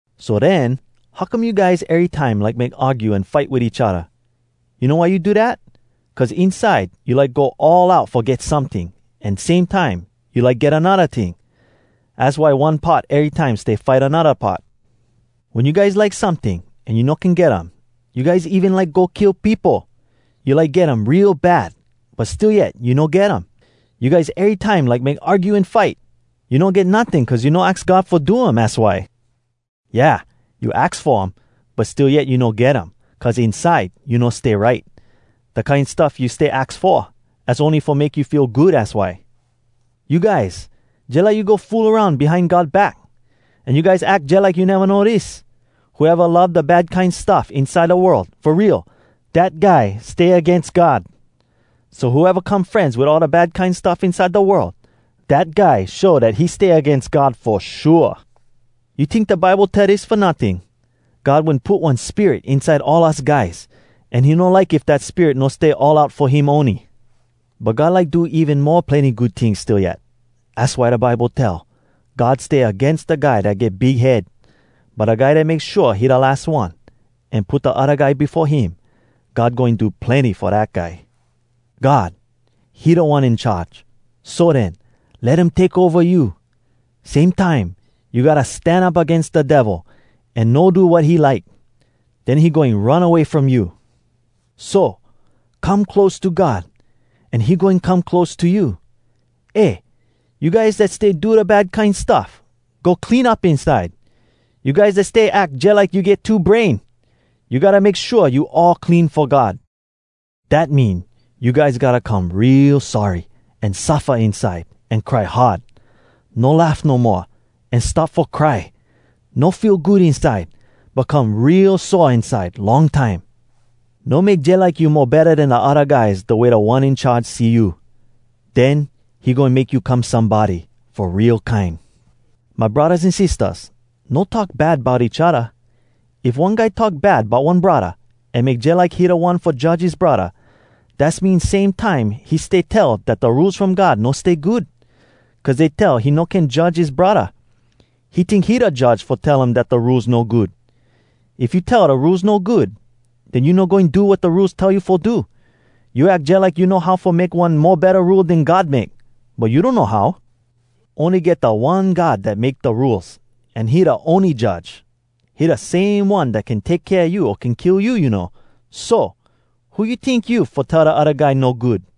So den, how come you guys erytime like make argue an fight wit each odda? You know why you do dat? Cuz inside, you like go all out fo get someting, an same time, you like get anodda ting. Az why one part erytime stay fight anodda part. Wen you guys like someting, an you no can get um, you guys even like go kill peopo. You like get um real bad, but still yet you no get um. You guys erytime like make argue an fight! You no get notting, cuz you no aks God fo um, az why! Yeah, you aks fo um, but still yet you no get um, cuz inside you no stay right. Da kine stuff you stay aks fo, az ony fo make you feel good, az why. You guys, jalike you go fool aroun behind God back! An you guys ack jalike you neva know dis: Whoeva love da bad kine stuff inside da world, fo real, dat guy stay agains God! So, whoeva come frenz wit all da bad kine stuff inside da world, dat guy show dat he stay agains God fo shua! You tink da Bible tell dis fo notting? “God wen put one spirit inside all us guys, an he no like if dat spirit no stay all out fo him ony.” But God like do even mo plenny good tings still yet. Az why da Bible tell, “God stay agains da guy Dat get big head. But da guy dat make shua he da las one, An put da odda guy befo him, God goin do plenny fo dat guy.” God, he Da One In Charge. So den, let him take ova you. Same time, you gotta stan up agains da Devil, an no do wat he like. Den he goin run away from you. So, come close to God, an he goin come close to you. Eh, you guys dat stay do da bad kine stuff—go clean up inside! You guys dat stay ack jalike you get two brain, you gotta make shua you all clean fo God! Dat mean, you guys gotta come real sorry, an suffa inside, an cry hard. No laugh no moa, an start fo cry. No feel good inside, but come real sore inside long time. No make jalike you mo betta den da odda guys da way Da One In Charge see you. Den, he goin make you come somebody fo real kine. My braddahs an sistahs, no talk bad bout each odda. If one guy talk bad bout one braddah, an make jalike he da one fo judge his braddah, dass mean same time he stay tell dat da Rules from God no stay good, cuz dey tell he no can judge his braddah. He tink he da judge fo him tell dat da Rules no good. If you tell da Rules no good, den you no goin do wat da Rules tell you fo do. You ack jalike you know how fo make one mo betta Rule den God make, but you donno how. Ony get da One God dat make da Rules, an he da ony Judge! He da same One dat can take kea you o can kill you, you know. So! Who you tink you, fo tell da odda guy no good?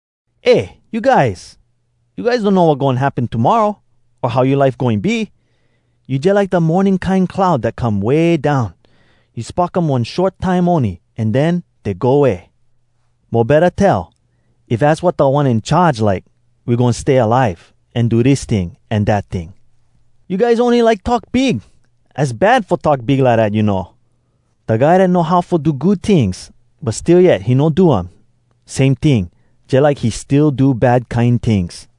Eh, you guys! You guys donno wat goin happen tomorra, o how yoa life goin be! You jalike da morning kine cloud dat come way down. You spock um one short time ony, an den, dey go way. Mo betta tell, “If az wat Da One In Charge like, we goin stay alive, an do dis ting an dat ting.” You guys, ony like talk big! Az bad, fo talk big lidat, you know! Da guy dat know how fo do good tings, but still yet he no do um, same ting, jalike he still do bad kine tings.